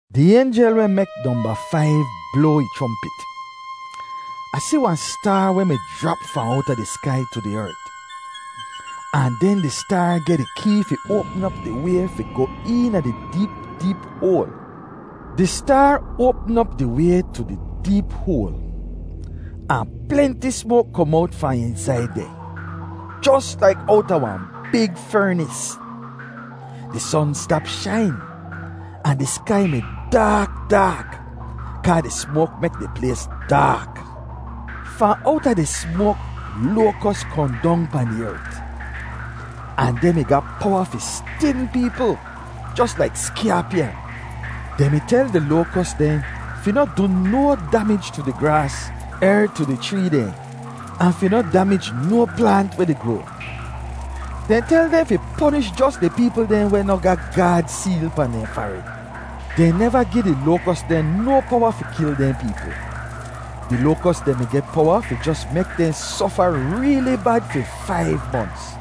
Di aynjel weh mek nomba faiv bloa ih chrompit. Ah si wahn staar weh mi jrap fahn owta di skai tu di ert. Ahn den di staar geh di kee fi oapm op di way fi goh eena di deep deep hoal. Di staar oapm op di way tu di deep hoal. Ahn plenti smoak kom owt fahn eensaid deh, jos laik owta wahn big fernis. Di son stap shain, ahn di skai mi daak daak, kaa di smoak mek di plays daak. Fahn owta di smoak loakos kohn dong pahn di ert. Ahn dehn mi ga powa fi stin peepl, jos laik skyaapyan. Dehn mi tel di loakos dehn fi noh du no damij tu di graas er tu di chree dehn, ahn fi noh damij no plaant weh di groa. Dehn tel dehn fi ponish jos di peepl dehn weh noh ga Gaad seel pahn dehn farid. Dehn neva gi di loakos dehn no powa fi kil dehn peepl. Di loakos dehn mi geh powa fi jos mek dehn sofa reeli bad fi faiv monts.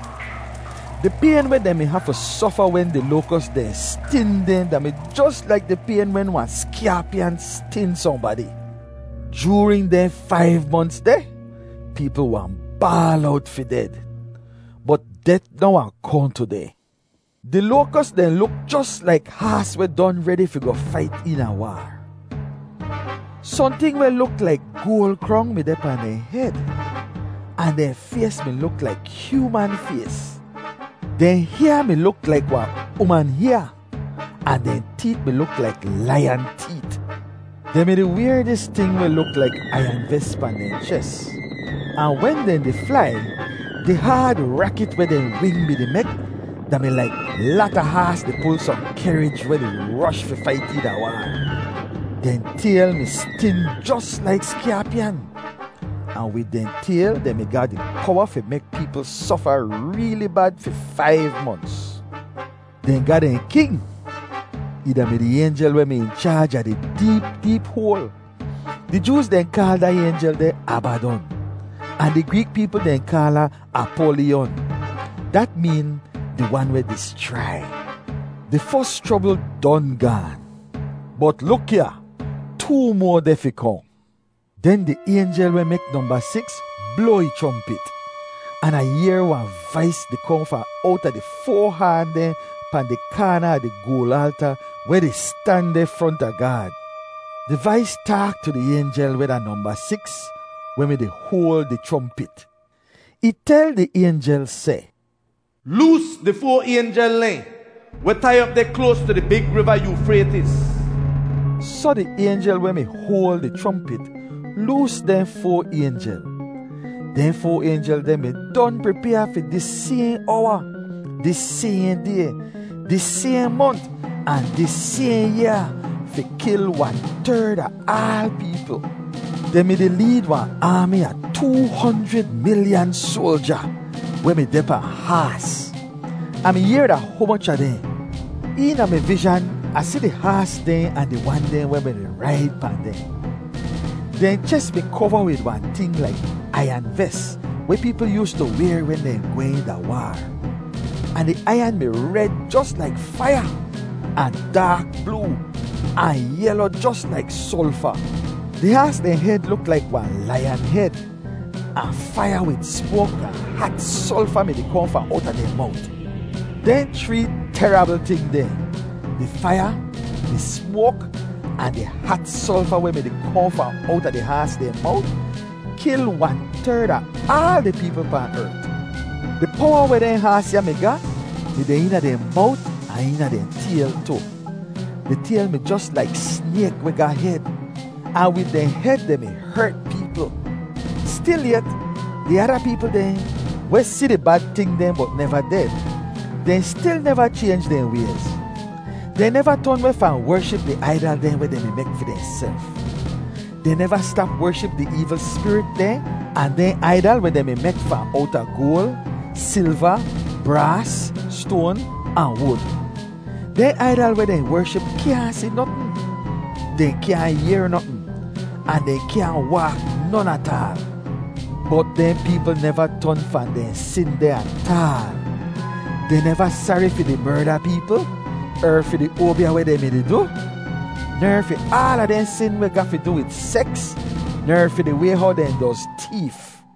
Di payn weh dehn mi hafu sofa wen di loakos dehn stin dehn da-mi jos laik di payn wen wahn skyaapyan stin sohnbadi. Joorin dehn faiv monts deh, peepl wahn baal owt fi ded. Bot det noh wahn kohn tu dehn. Di loakos dehn luk jos laik haas weh don redi fi goh fait eena waar. Sohnting weh luk laik goal krong mi deh pahn dehn hed, ahn dehn fays mi luk laik hyooman fays. Dehn hyaa mi luk laik wahn uman hyaa, ahn dehn teet mi luk laik laiyan teet. Dehn mi-di wayr dis ting weh luk laik aiyan ves pahn dehn ches. Ahn wen dehn di flai, di haad rakit weh dehn wing mi-di mek da-mi laik lata haas di pul sohn kehrij weh di rosh fi fait eena waar. Dehn tayl mi stin jos laik skyaapyan, ahn wid dehn tayl dehn mi ga di powa fi mek peepl sofa reeli bad fi faiv monts. Dehn ga dehn king. Ih da-mi di aynjel weh mi in chaaj a di deep deep hoal. Di Jooz dehn kaal da aynjel deh Abadon ahn di Greek peepl dehn kaal ahn Apolyon. (Dat meen, “Di wan weh dischrai.”) Di fos chrobl don gaan. Bot luk ya, too moa deh fi kohn. Den di aynjel weh mek nomba siks bloa ih chrompit, an Ah yehr wahn vais di kohn fahn owta di foa haan dehn pahn di kaana a di goal alta weh di stan deh fronta Gaad. Di vais taak tu di aynjel weh da nomba siks weh mi-di hoal di chrompit. Ih tel di aynjel seh, “Loos di foa aynjel dehn weh tai op deh kloas tu di big riva Yoofraytis!” Soh di aynjel weh mi hoal di chrompit, loos dehn foa aynjel. Dehn foa aynjel deh mi don pripyaa fi dis sayhn owa, dis sayhn day, dis sayhn mont, ahn dis sayhn yaa fi kil wan-terd a aal peepl. Dehn mi-di leed wahn aami a too honjrid milyan soalja weh mi deh pahn haas; Ah mi yehr da humoch a dehn. Eena mi vizhan Ah si di haas dehn ahn di wan dehn weh mi-di raid pahn dehn. Dehn ches mi kova wid wahn ting laik aiyan ves weh peepl yoostu wayr wen dehn gwehn da waar. Ahn di aiyan mi red jos laik faiya, ahn daak bloo, ahn yelo jos laik solfa. Di haas dehn hed luk laik wahn laiyan hed, ahn faiya wid smoak ahn hat solfa mi-di kohn fahn owta dehn mowt. Dehn chree terabl ting dehn, di faiya, di smoak, ahn di hat solfa weh mi-di kohn fahn owta di haas dehn mowt, kil wan-terd a aal di peepl pahn ert. Di powa weh dehn haas ya mi ga, mi deh eena dehn mowt ahn eena dehn tayl tu. Di tayl mi jos laik snayk weh ga hed, ahn wid dehn hed dehn mi hert peepl. Stilyet, di ada peepl dehn, weh si di bad ting dehn bot neva ded, dehn stil neva chaynj dehn wayz. Dehn neva ton weh fahn wership di aidal dehn weh dehn mi mek fi dehnself. Dehn neva stap wership di eevl spirit dehn ahn dehn aidal weh dehn mi mek fahn owta goal, silva, braas, stoan ahn wud. Dehn aidal weh dehn wership kyaahn si notn; dehn kyaahn yehr notn, ahn dehn kyaahn waak non ataal. Bot dehn peepl neva ton fahn dehn sin dehn ataal. Dehn neva sari fi di merda peepl, er fi di oabya weh dehn mi-di du, ner fi aala dehn sin weh ga fi du wid seks, ner fi di way how dehn doz teef.